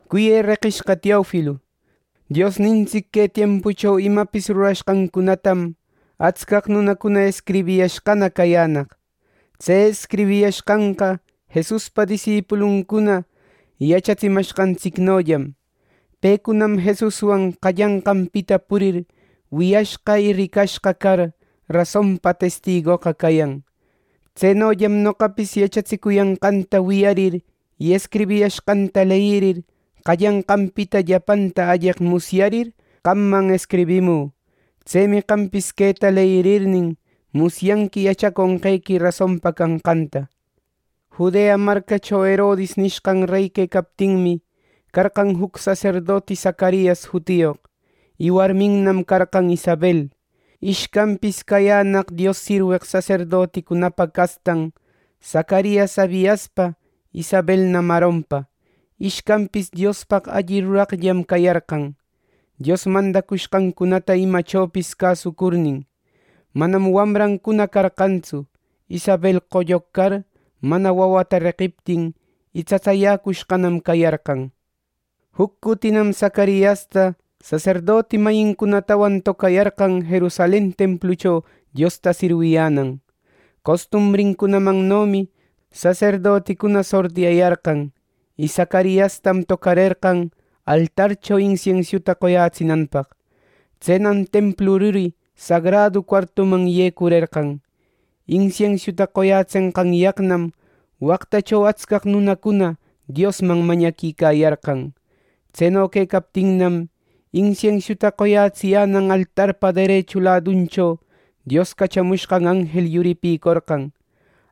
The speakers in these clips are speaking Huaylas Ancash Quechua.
Cuyë reqishqa Teofilo, Diosnintsic que tiempucho imapis rurashqancunatam atscaq nunacuna escribiyashqana cayänaq. Tse escribiyashqanqa Jesuspa disipuluncuna yachatsimashqantsicnollam. Pecunam Jesuswan qallanqanpita purir, wiyashqa y ricashqa car, rasonpa testigoqa cayan. Tsenollam noqapis yachatsicuyanqanta wiyarir y escribiyashqancunata leyirir, qallananpita llapanta alleq musyarir, qamman escribimü. Tsemi qampis queta leyirirnin, musyanqui yachaconqequi rasonpa canqanta. Judea marcacho Herodis nishqan rey quecaptinmi, carqan juc saserdoti Zacarias jutiyoq; y warminnam carqan Isabel. Ishcanpis cayänaq Dios sirweq saserdoticunapa castan: Zacarias Abiaspa, Isabelnam Aaronpa. Ishcanpis Diospaq alli ruraqllam cayarqan, Dios mandacushqancunata imachopis cäsucurnin. Manam wamrancuna carqantsu, Isabel qolloq car; mana wawata reqiptin, y tsatsayäcushqanam cayarqan. Juc cutinam Zacariasta saserdoti mayincunatawan tocayarqan Jerusalen templucho Diosta sirwiyänan. Costumbrincunamannomi saserdoticuna sortiyayarqan, y Zacariastam tocarerqan altarcho insiensiuta qoyätsinanpaq. Tsenam templu ruri sagradu cuartuman yecurerqan. Insiensiuta qoyätsenqanyaqnam waqtacho atscaq nunacuna Diosman mañaquicayarqan. Tseno quecaptinnam, insiensiuta qoyätsiyänan altarpa derechu laduncho Dios cachamushqan anjel yuripïcorqan.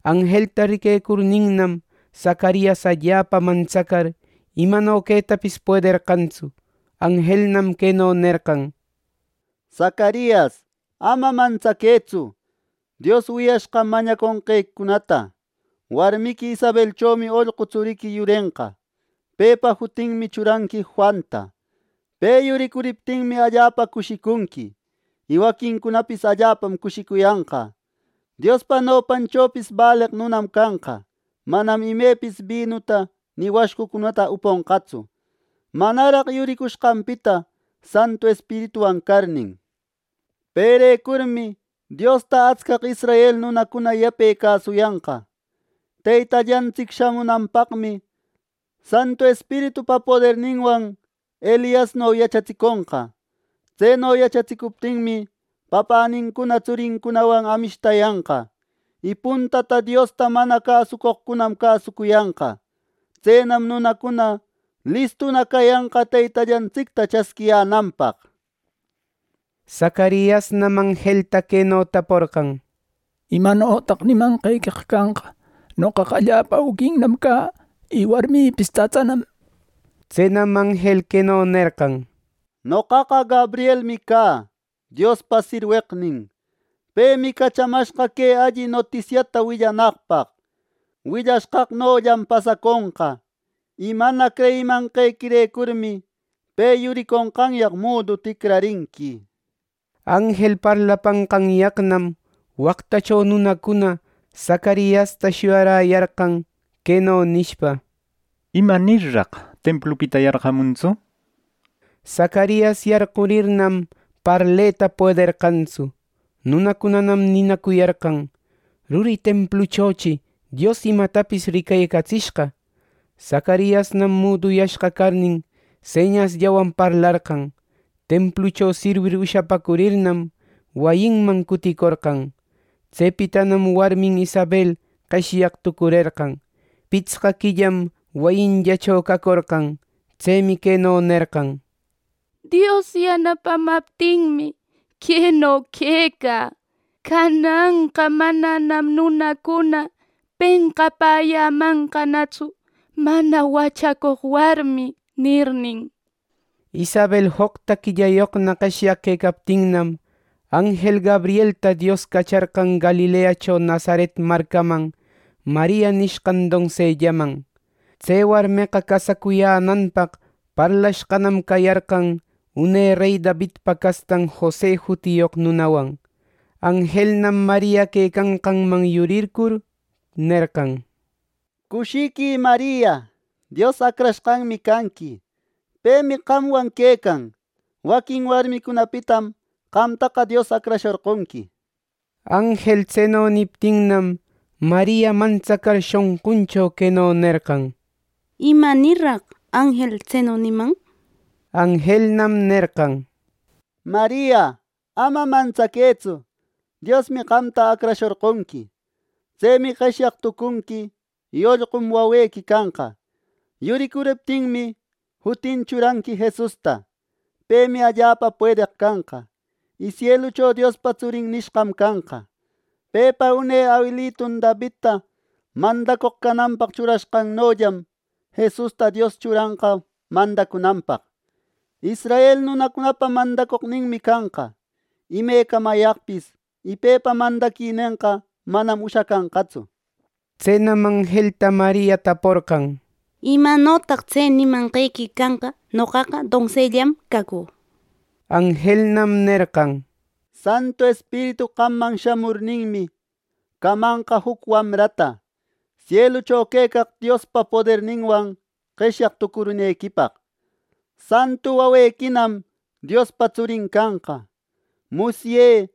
Anjelta riquecurninnam, Zacarias allapa mantsacar, imano quetapis puederqantsu. Anjelnam queno nerqan: —Zacarias, ama mantsaquëtsu. Dios wiyashqam mañaconqequicunata; warmiqui Isabelchomi ollqu tsuriqui yurenqa. Pepa jutinmi churanqui “Juanta”. Pe yuririptinmi, allapa cushicunqui; y waquincunapis allapam cushicuyanqa. Diospa nopanchopis baleq nunam canqa. Manam imepis binuta ni washcucunata uponqatsu, manaraq yuricushqanpita Santu Espirituwan carnin. Perecurmi Diosta atscaq israel nunacuna yape cäsucuyanqa. Teytallantsic shamunanpaqmi Santu Espiritupa poderninwan Eliasno yachatsiconqa. Tseno yachatsicuptinmi, papänincuna tsurincunawan amishtayanqa. Y puntata Diosta mana cäsucoqcunam cäsucuyanqa. Tsenam nunacuna listuna cayanqa Teytallantsicta chasquiyänanpaq. Zacariasnam anjelta queno taporqan: —¿Imanotaq nimanqequeqa canqa? Noqaqa allapa auquinnam cä, y warmïpis tsatsanam. Tsenam anjel queno nerqan: —Noqaqa Gabrielmi cä, Diospa sirweqnin. Pemi cachamashqa que alli notisiata willanaqpaq. Willashqaqnollam pasaconqa, y mana creyimanqequirecurmi, pe yuriconqanyaq mudu ticrarinqui. Anjel parlapanqanyaqnam, waqtacho nunacuna Zacariasta shuyaräyarqan, queno nishpa: —¿Imanirraq templupita yarqamuntsu? Zacarias yarqurirnam, parleta puederqantsu. Nunacunanam ninacuyarqan: —¡Ruri templuchochi Dios imatapis ricatsishqa! Zacariasnam muduyashqa carnin, señasllawan parlarqan. Templucho sirwir ushapäcurirnam, wayinman cuticorqan. Tsepitanam warmin Isabel qeshyaq tucurerqan. Pitsqa quillam wayinllacho cacorqan. Tsemi queno nerqan: —Dios yanapamaptinmi, queno quecä. Cananqa mananam nunacuna penqapäyämanqanatsu, “mana wachacoq warmi” nirnin. Isabel joqta quillayoqna qeshyaq quecaptinnam, anjel Gabrielta Dios cacharqan Galileacho Nazaret marcaman Maria nishqan donsellaman. Tse warmeqa casacuyänanpaq parlashqanam cayarqan une rey Davidpa castan Jose jutiyoq nunawan. Anjelnam Maria quecanqanman yurircur, nerqan: —¡Cushiquï, Maria! Dios acrashqanmi canqui. Pemi qamwan quecan. ˻Waquin warmicunapitam qamtaqa Dios acrashorqonqui.˼ Anjel tseno niptinnam, Maria mantsacar shonquncho, queno nerqan: —¡Imanirraq anjel tseno niman! Anjelnam nerqan: —Maria, ama mantsaquëtsu. Diosmi qamta acrashorqonqui. Tsemi qeshyaq tucunqui. Y ollqum wamrequi canqa. Yuricuriptinmi, jutin churanqui “Jesusta”. Pemi allapa puedeq canqa, y sielucho Diospa tsurin nishqam canqa. Pepa une awilitun Davidta mandacoq cananpaq churashqannollam, Jesusta Dios churanqa mandacunanpaq. Israel nunacunapa mandacoqninmi canqa imecamayaqpis; y pepa mandaquinenqa manam ushacanqatsu. Tsenam anjelta Maria taporqan: —¿Imanotaq tse nimanqequi canqa? Noqaqa donsellam cacü. Anjelnam nerqan: —Santu Espiritu qamman shamurninmi, camanqa juc wamrata, sielucho quecaq Diospa poderninwan qeshyaq tucurinequipaq. Santu wawequinam Diospa tsurin canqa. Musyë,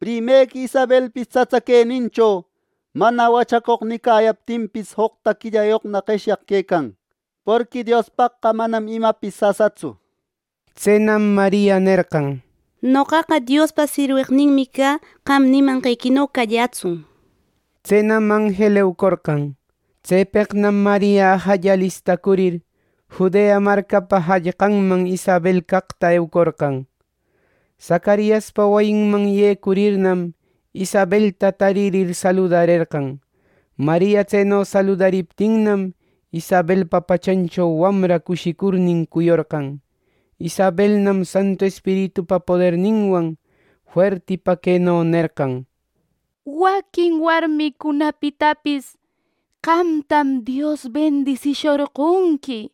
primequi Isabelpis tsatsa queninchomi “mana wachacoq” nicayaptinpis joqta quillayoqna qeshyaq quecan. Porqui Diospaqqa manam imapis sasatsu. Tsenam Maria nerqan: —Noqaqa Diospa sirweqninmi cä. Qam nimanqequino callätsun. Tsenam anjel eucorqan. Tsepeqnam Maria ajalla alistacurir, Judea marcapa jallqanman Isabel caqta eucorqan. Zacariaspa wayinman yecurirnam, Isabelta taririr, saludarerqan. Maria tseno saludariptinnam, Isabelpa pachancho wamra cushicurnin cuyorqan. Isabelnam Santu Espiritupa poderninwan fuertipa queno nerqan: —Waquin warmicunapitapis qamtam Dios bendisishorqonqui,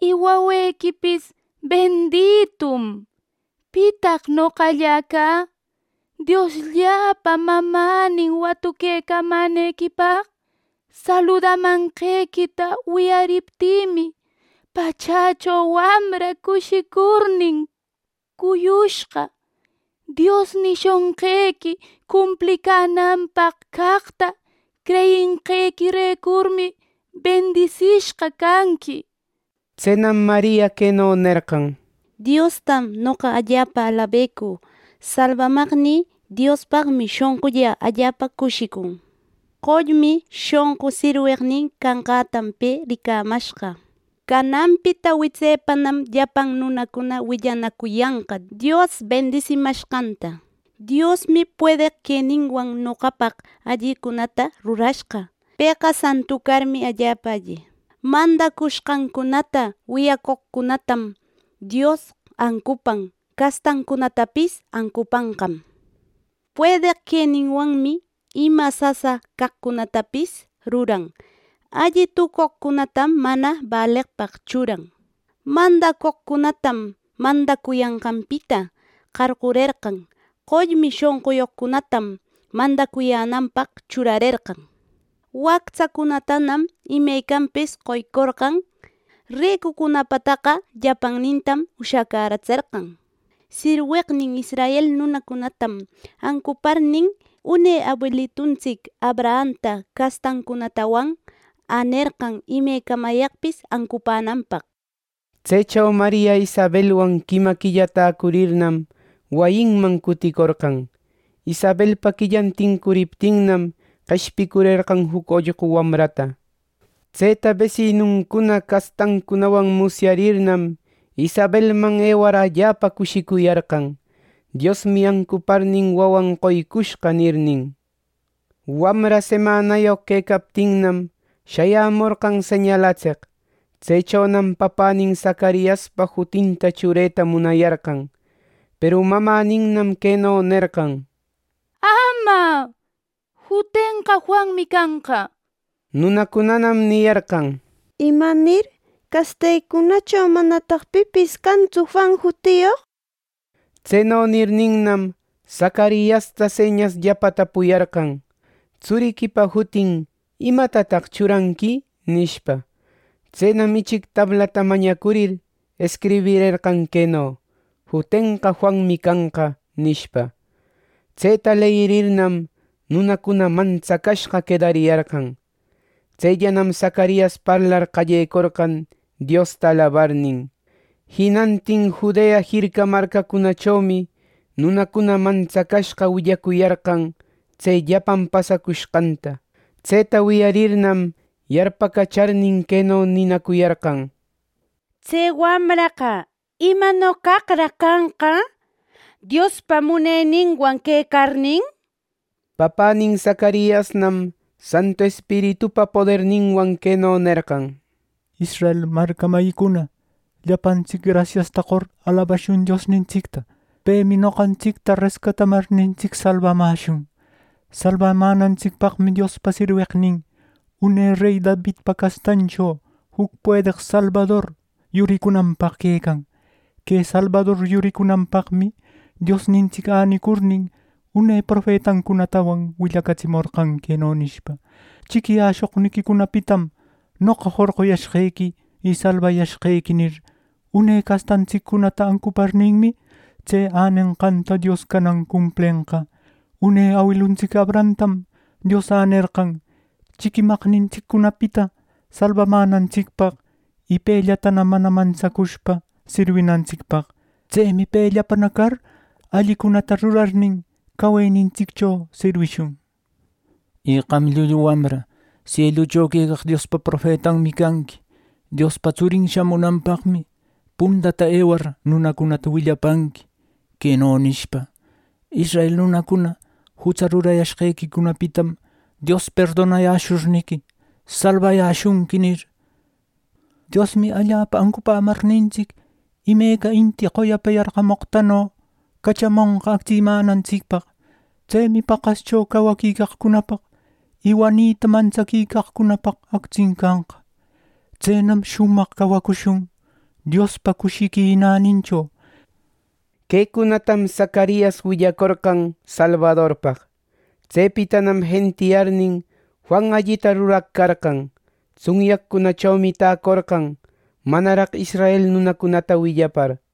y wawequipis benditum. ¿Pitaq noqallä cä, Dioslläpa mamänin watuquecamänequipaq! Saludamanqequita wiyariptïmi, pachächo wamra cushicurnin cuyushqa. Dios nishonqequi cumplicänanpaq caqta creyinqequirecurmi, bendisishqa canqui, nir. Tsenam Maria queno nerqan: “Diostam noqa allapa alabecü. Salbamaqnï Diospaqmi shonqullä allapa cushicun. Qollmi shonqu sirweqnin canqätam, pe ricamashqa. Cananpita witsepanam llapan nunacuna willanacuyanqa Dios bendisimashqanta. Diosmi puedeq queninwan, noqapaq allicunata rurashqa. Pëqa santu carmi, allapa alli. Mandacushqancunata wiyacoqcunatam Dios ancupan; castancunatapis ancupanqam. Puedeq queninwanmi ima sasa caqcunatapis ruran. Alli tucoqcunatam mana baleqpaq churan. Mandacoqcunatam mandacuyanqanpita qarqurerqa, qollmi shonquyoqcunatanam mandacuyänanpaq churarerqan. Wactsacunatanam imecanpis qoycorqan. Ricucunapataqa llapannintam ushacäratserqan. Sirweqnin israel nunacunatam ancuparnin, une awiluntsic Abrahamta castancunatawan änerqan, imecamayaqpis ancupänanpaq” nir. Tsecho Maria Isabelwan quima quilla täcurirnam, wayinman cuticorqan. Isabelpa quillan tincuriptinnam, qeshpicurerqan juc ollqu wamrata. Tseta besinuncuna castancunawan musyarirninnam, Isabelman ewar allapa cushicuyarqan, “Diosmi ancuparnin, wawan qoycushqa” nirnin. Wamra semanayoq quecaptinnam, shayämorqan señalatseq. Tsechonam papänin Zacariaspa jutinta chureta munayarqan. Peru mamäninnam queno nerqan: —¡Ama! ¡Jutenqa Juanmi canqa! —nir. Nunacunanam niyarqan: —¿Imanir? ¡Castequicunacho manataq pipis cantsu Juan jutiyoq! Tseno nirninnam, Zacariasta señasllapa tapuyarqan: —Tsuriquipa jutin ¿imatataq churanqui? —nishpa. Tsenam ichic tablata mañacurir, escribirerqan queno: “Jutenqa Juanmi canqa” nishpa. Tseta leyirirnam, nunacuna mantsacashqa quedariyarqan. Tsellanam Zacarias parlar qallecorqan, Diosta alabarnin. Jinantin Judea jirca marcacunachomi nunacuna mantsacashqa willacuyarqan tse llapan pasacushqanta. Tseta wiyarirnam, yarpacacharnin queno ninacuyarqan: —Tse wamraqa ¿imano caqraq canqa, Diospa muneninwan quecarnin? —nir. Papänin Zacariasnam Santu Espiritupa poderninwan queno nerqan: “Israel marca mayicuna, llapantsic grasiasta qor, ¡alabashun Diosnintsicta! Pemi noqantsicta rescatamarnintsic, salbamäshun. Salbamänantsicpaqmi Diospa sirweqnin une rey Davidpa castancho, juc puedeq salbador yuricunanpaq quecan. Que salbador yuricunanpaqmi Diosnintsic änicurnin, une profetancunatawan willacatsimorqan, queno nishpa: ‘Chiquiyäshoqniquicunapitam noqa jorquyashqequi y salbayashqequi’ nir. Une castantsiccunata ancuparninmi, tse änenqanta Dios canan cumplenqa. Une awiluntsic Abrahamtam Dios änerqan chiquimaqnintsiccunapita salbamänantsicpaq, y pellatana mana mantsacushpa sirwinantsicpaq. Tsemi pellapaqna car allicunata rurarnin, cawenintsiccho sirwishun. Y qam llullu wamra, sielucho quecaq Diospa profetanmi canqui. Diospa tsurin shamunanpaqmi puntata ewar, nunacunata willapanqui, queno nishpa: ‘Israel nunacuna jutsa rurayashqequicunapitam, Dios perdonayäshurniqui, salbayäshunqui’ nir. Diosmi allapa ancupämarnintsic, imeca inti qoyapa yarqamoqtano cachamonqa actsimänantsicpaq. Tsemi paqascho cawaquicaqcunapaq, y wanita mantsaquicaqcunapaq actsin canqa. ¡Tsenam shumaq cawacushun Diospa cushiqui nänincho!” Quecunatam Zacarias willacorqan salbadorpaq. Tsepitanam jentiyarnin, Juan allita ruraq carqan. Tsunyaqcunachomi täcorqan, manaraq israel nunacunata willapar.